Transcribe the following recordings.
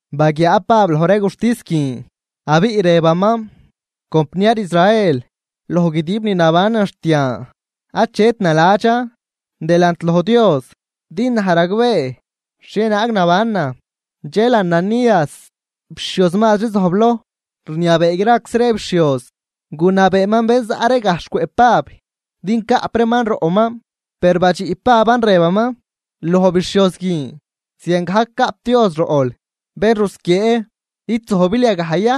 Baguiaa Pab loj ree guxtis guin, abiꞌ rëbaman: ―Compniar Israel, loj guidib ni nabanan xt yan, achet naladxan delant loj Dios din naj ragbee xhienaag nabanan. Dxel Ananías, bixhioz mazri zojbloj rniabee graczi ree bixhioz, gunabeeman bén zaꞌ ree gajxh cwëꞌ Pab din caꞌp reeman roꞌman. Per badxiꞌ Paban rëbaman loj bixhioz guin: ―¡Ziangajc caꞌp Dios roꞌl, bén rusquiee! ¿Id zojbil yagaj ya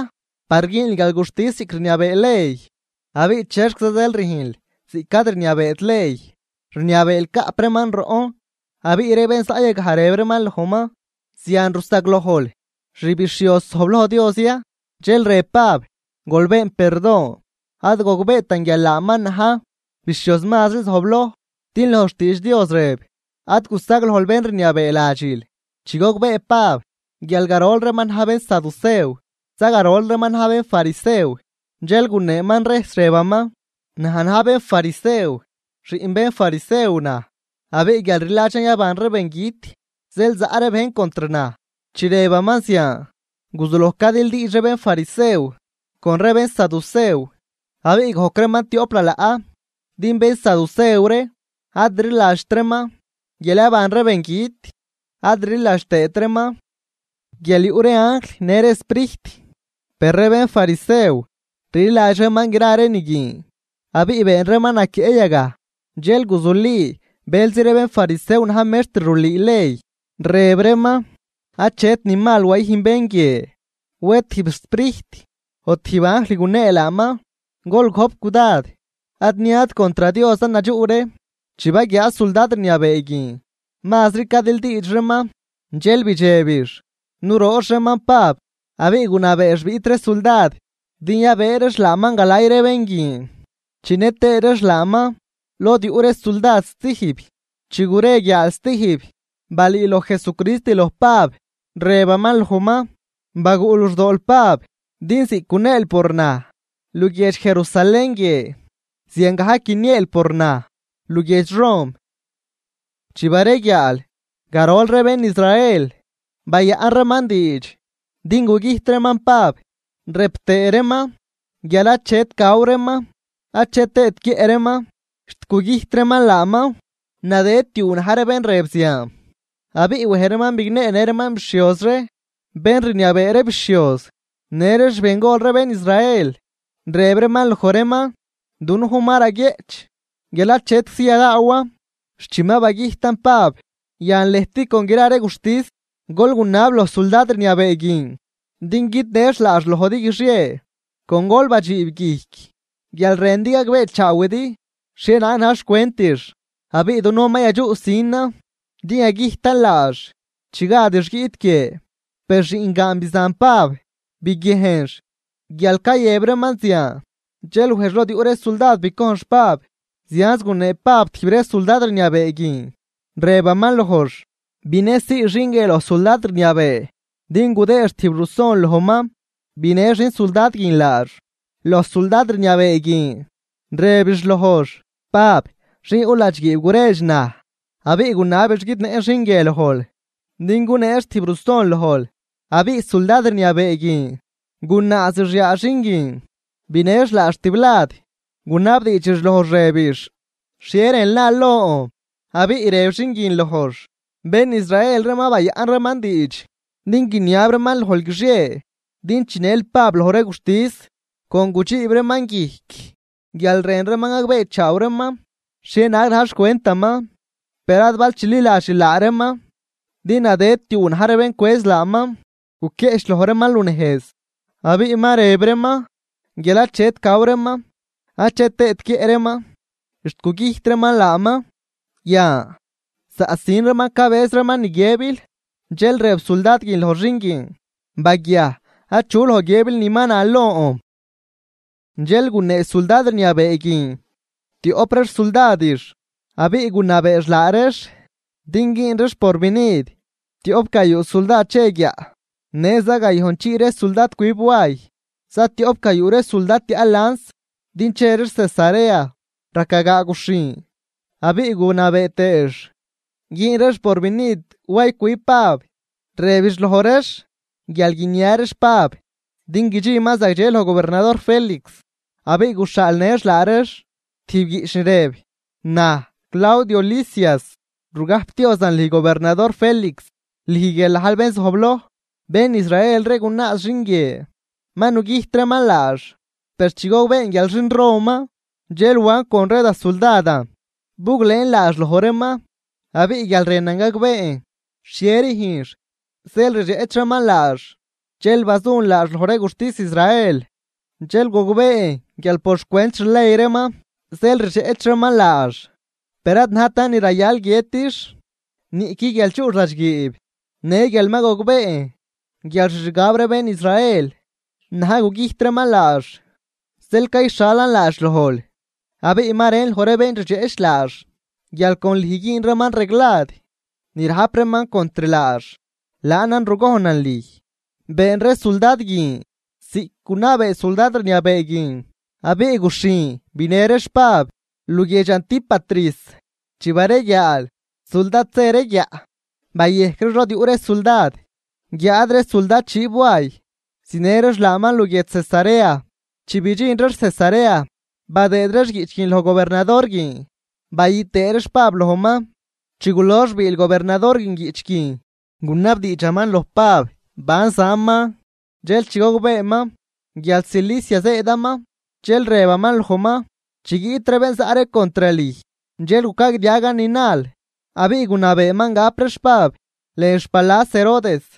par güünl guialguxtis ziꞌc rniabee ley? Abiꞌ ¿chexquiza zeel rüjnl ziꞌc ad rniabeet ley, rniabeel caꞌp reeman roꞌn? Abiꞌ ree bén zaꞌ yagaj rëb reeman lojman: ―¿Zian rusaglojl xbixhioz zojbloj Dios ya? Dxel rëb Pab: ―Gol been perdon, ad gogbeetan guial laaman na̱j bixhioz mazri zojbloj. Din loj xtiidx Dios rëb: “Ad gusaglojl bén rniabee ladxil.” Chi gogbee Pab guial garol reeman na̱j bénsaducew za garol reeman na̱j bénfarisew, dxel guneeman rejs rëbaman: ―Naj na̱j bénfarisew, xiꞌn bénfarisew naj. Abiꞌ guial rliladxan yaban ree bengüt zeel zaꞌ ree bejn contr naj. Chi rëbaman zian, guzuloj cadildiidx ree bénfarisew con ree bénsaducew abiꞌ gojc reeman tioꞌp lalaꞌ. Din bénsaducew ree ad rliladxt reeman guial yaban ree bengüt, ad rliladx tëët reeman guial yuꞌ ree anjl në ree sprijt, per ree bénfarisew rliladx reeman gra ree ni guin. Abiꞌ been reeman naquieꞌ yagaj. Dxel guzuli bëlzi ree bénfarisew na̱j mextr rulüü ley, rëb reeman: ―Achet ni mal wayüjn bén guie. Wed tijb sprijt o tijb anjl gunee laaman, gol gojp cudad ad niad contr Diosan nadxuꞌ ree. Chi baguiaa suldad rniabee guin mazri cadildiidx reeman, dxel bidxebix nuroox reeman Pab. Abiꞌ gunabeex biꞌt ree suldad din yabëë reex laaman galay ree bén guin, chinë tëë reex laaman lod yuꞌ ree suldad stijb. Chi gure guiaal stijb, balüüloj Jesucrist loj Pab, rëbaman lojman: ―Baguꞌ luxdool Pab, din ziꞌc guneel por naj luguiedx Jerusalén guie, ziangajc guinieel por naj luguiedx Rom. Chi bareguiaal, garol ree bén Israel bayaꞌn reeman diidx din gugüjt reeman Pab, rëb tëë reeman guial achet gaw reeman achet tëët guiëꞌ reeman xt gugüjt reeman laaman. Nadëd tiuu na̱j ree bén rëb zian. Abiꞌ wej reeman bigneenë reeman bixhioz ree bén rniabee ree bixhioz në ree xbengol ree bén Israel, rëb reeman loj reeman: ―Dunujn ma raguieꞌch guial achetczi yadaawan xt chi ma bagüjtan Pab. Yan lëjt con gra ree guxtis, gol gunab loj suldad rniabee guin din guidnëx laax lojdi guixie, con gol badxiib guijc guial rëndi gagbeechaawidi xhienaag na̱j xcwentix. Abiꞌ dunujn ma yadxuꞌsinan din yagüjtan laax chi gadix guiꞌt guie. Per xiꞌngaan bizan Pab biguiejnx guial cayëb reeman zian, dxel wejx lod yuꞌ ree suldad bicojnx Pab. Zianz gunee Pab tijb ree suldad rniabee guin, rëbaman lojx: ―Binësii xin guie loj suldad rniabee din gudëëx tijb ruson lojman. Binë xin suldad guin laax loj suldad rniabee guin, rëbix lojx: ―Pab, xin yuꞌ ladxguiib guredx naj abiꞌ gunabix guidnëꞌn xin guie lojl din guneex tijb ruson lojl. Abiꞌ suldad rniabee guin gunaazix yaa xin guin, binëx laax tiblad, gunabdiidxix lojx rëbix: ―¿Xhie rënl nal lon? Abiꞌ rëb xin guin lojx: ―Bén Israel ree ma bayaꞌn reeman diidx din guiniab reeman lojl guixie din chinël Pab loj ree guxtis, con gudxiib reeman guijc guial rën reeman gagbeechaaw reeman xhienaag na̱j xcwentaman. Per ad bal chililadxil laa reeman, din nadëd tiuu na̱j ree bén cwëz laaman guquieꞌchloj reeman lunejz, abiꞌ ma rëb reeman guial achet gaw reeman ache tëët guiëꞌ reeman xt gugüjt reeman laaman. Yan zaꞌsin reeman cabëz reeman ni guiëbil. Dxel rëb suldad guin loj xin guin: ―Baguiaj. Achu loj guiëbil ni ma nal lon. Dxel gunee suldad rniabee guin tioꞌp ree xsuldadix, abiꞌ gunabeex laa reex din güün reex porvinid tioꞌp gayuu suldad che guiaꞌ, në za gayojnchii ree suldad cwib way, zatioꞌp gayuu ree suldad tiaꞌ lans din che reex Cesarea raca gaa guxhin. Abiꞌ gunabee tëëx güün reex porvinid way cwib Pab, rëbix loj reex guial guinia reex Pab din guidxinman zagdxe loj gobernador Félix. Abiꞌ guxhaalnëx laa reex tijb guiꞌch ni rëb: “Naj Claudio Lisias, rugajpdiozan lüj gobernador Félix, lüj guial najl bén zojbloj. Bén Israel ree gunaaz xin guie ma nugüjt reeman laax. Per chi gogbeen guial xin Roman, dxel wan con ree da suldadan buglëën laax loj reeman. Abiꞌ guial rënan gagbeen xhie rüjnx zeel rdxeꞌch reeman laax, dxel bazun laax loj ree guxtis Israel. Dxel gogbeen guial por xcwent xley reeman zeel rdxeꞌch reeman laax, per ad najtan ni rayal guiëtix niꞌqui guial chuꞌx ladxguiib. Në guial ma gogbeen guial xixgab ree bén Israel na̱j gugüjt reeman laax, zeel cayxhalan laax lojl. Abiꞌ ma rën loj ree bén rdxeꞌch laax guial con lüj güün reeman reglad ni rajp reeman contr laax. Laanan rugojnan lüj.” Been ree suldad guin ziꞌc gunabee suldad rniabee guin abiꞌ guxhin binë reex Pab luguiedx Antípatris. Chi bareguiaal suldad zë ree guiaꞌ bayejc reex lod yuꞌ ree suldad, guiáad ree suldad dxiib way zinë reex laaman luguiedx Cesarea. Chi bidxin reex Cesarea, badëëd reex guiꞌch guin loj gobernador guin, bayü tëë reex Pab lojman. Chi gulox biil gobernador guin guiꞌch guin, gunabdiidxaman loj Pab ban zaman. Dxel chi gogbeeman guial Cilicia zëëdaman, dxel rëbaman lojman: ―Chi guiꞌt ree bén zaꞌ ree contr lüj, dxel gucagdiagan ni nal. Abiꞌ gunabeeman gap reex Pab lën xpalas Herodes.